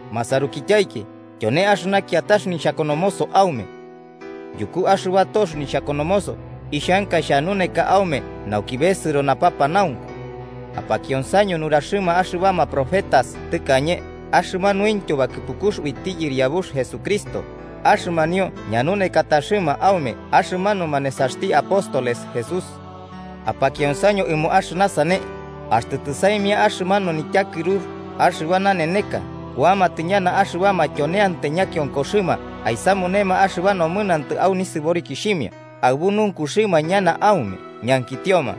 Masarukityaiki, tyone axɨna kiatax nixhakonomoso aume. Yuku axɨba tox nixhakonomoso ixhanka xhanuneka aume nauki besɨro napapanaunku. Apakionsaño nuraxɨma axɨbama profetas tɨkañe, axɨmanuintyo bakɨpukux uiti Yɨriabux Jesucristo, axɨmanio ñanunekataxɨma aume axɨmanuma nesaxti apóstoles Jesús. Apakionsaño ɨmo axɨna sane: axtɨ tɨsaimia axɨmanu nityakɨrux axɨba naneneka kuamatɨ ñana axɨbama tyoneantai ñakionkoxɨma aisamunema axɨba nomɨnantɨ au nisɨborikixhimia, aɨbu nunkuxɨma ñana aume, ñankitioma: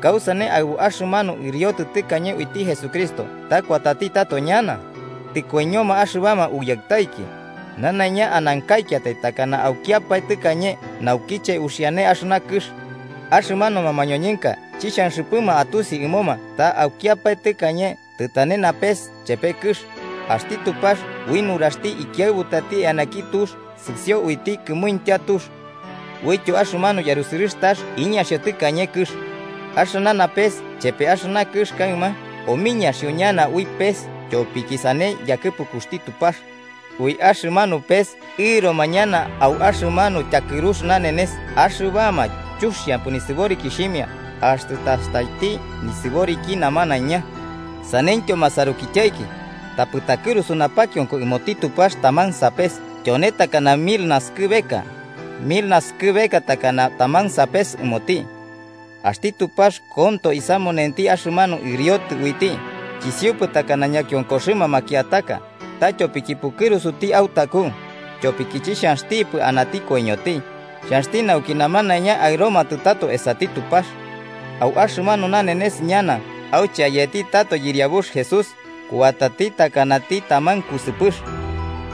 “¿Kausane aɨbu axɨmanu ɨriotɨ tɨkañe uiti Jesucristo ta kuatati tato ñana? Tɨkoiñoma axɨbama uyaɨtaiki, nanaiña anankaikiatai takana aukiapae tɨkañe naukiche uxiane axɨna kɨx.” Axɨmanuma mañoñɨnka chixhanxɨpɨma atusi ɨmoma ta aukiapae tɨkañe tɨtane napes chepe kɨx, axti Tupax ui nuraxti ikiaɨbutati eanaki tux sɨsio uiti kɨmuintya tux. Uityo axɨmanu yarusɨrɨx tax iñaxio tɨkañe kɨx. Axɨna napes chepe axɨna kɨx kaɨma, omiñaxio ñana ui pes tyopiki sane yakɨpukuxti Tupax. Ui axɨmanu pes ɨroma ñana au axɨmanu tyakɨrux nanenes axɨbama chuxiampɨ nisɨborikixhimia axtɨ tastaiti nisɨboriki namanaiña. Saneityo masarukityaiki, tapɨ takɨrusu napakionko ɨmoti Tupax taman sapes tyone takana mil naskɨbeka, mil naskɨbeka takana taman sapes ɨmoti. Axti Tupax konto isamunenti axɨmanu ɨriotɨ uiti, chisiupɨ takana ñakionkoxɨma makiataka, ta tyopiki pukɨrusuti autaku, tyopiki chixhanxtipɨ anati koiñoti, xhanxti nauki namanaiña aɨromatɨ tato esati Tupax. Au axɨmanu nanenes ñana auche ayetitɨ tato Yɨriabux Jesús, kuatati takanati taman kusɨpɨx.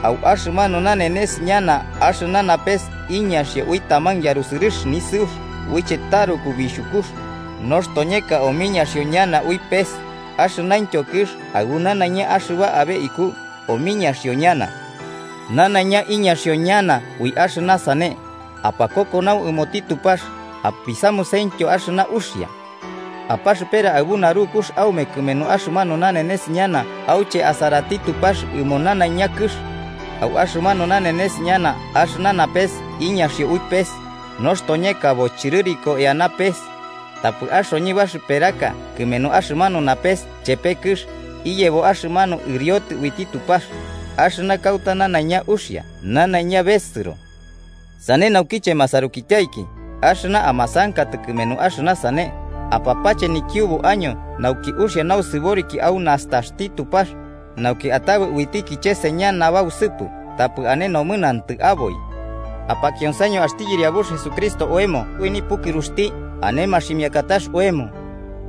Au axɨmanu nanenes ñana axɨna napes iñaxio ui taman yarusɨrɨx nisɨux uiche taruku bixhukux, nostoñeka omiñaxio ñana ui pes, axɨnaintyo kɨx aɨbu nanaiña axɨba abe iku omiñaxio ñana. Nanaiña iñaxio ñana ui axɨna sane, ¡apakokonau ɨmoti Tupax apisamusentyo axɨna uxia! Apaxɨpera aɨbu narukux aume kɨmenu axɨmanu nanenes ñana auche asaraiti Tupax ɨmo nanaiña kɨx. Au axɨmanu nanenes ñana axɨna napes iñaxio ui pes, nostoñeka bochɨrɨriko eana pes. Tapɨ axoñɨ barɨperaka kɨmenu axɨmanu napes chepe kɨx iyebo axɨmanu ɨriotɨ uiti Tupax, axɨna kauta nanaiña uxia nanaiña besɨro. Sane naukiche, masarukityaiki, axɨna amasankatɨ kɨmenu axɨna sane, apapache nikiubu año nauki uxia nausɨboriki au nastaxti Tupax, nauki atabɨ uiti kicheseña nabausɨpɨ tapɨ ane nomɨnantɨ aboi. Apakionsaño axti Yɨriabux Jesucristo oemo ui nipukɨruxti ane maximiakatax oemo.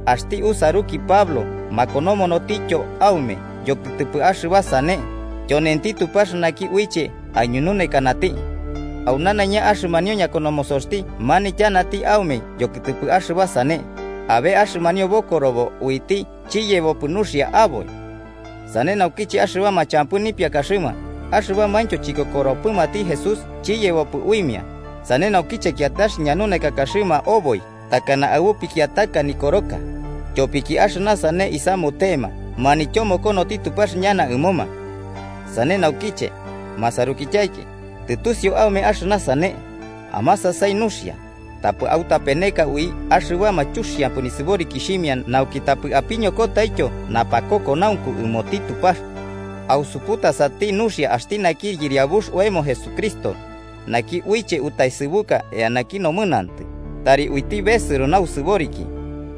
Axti usaruki Pablo makonomonotityo aume yokɨtɨpɨ axɨba sane, tyonenti Tupax naki uiche aiñununekanati. Au nanaiña axɨmanio ñakonomosoxti manityanati aume yokɨtɨpɨ axɨba sane, abe axɨmanio bokorobo uiti chiyebopɨ nuxia aboi. Sane naukiche axɨbama champɨ nipiakaxɨma axɨbamaintyo chikokoropɨmati Jesús chiyebopɨ uimia, sane naukiche kiatax ñanunekaxɨma oboi takana aɨbu pikiataka Nikoroka, tyopiki axɨna sane isamutema manityomokonoti Tupax ñana ɨmoma. Sane naukiche, masarukityaiki, tɨtusiu aume axɨna sane, amasasai nuxia, tapɨ autapeneka ui axɨbama chuxiampɨ nisɨborikixhimia nauki tapɨ apiñokotaityo napakokonaunku ɨmoti Tupax. Ausuputasati nuxia axti naki Yɨriabux oemo Jesucristo, naki uiche utaesɨbuka eanaki nomɨnantɨ, tari uiti besɨro nausɨboriki.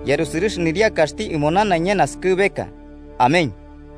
¡Yarusɨrɨx niriakaxti ɨmo nanaiña naskɨbeka! Amén.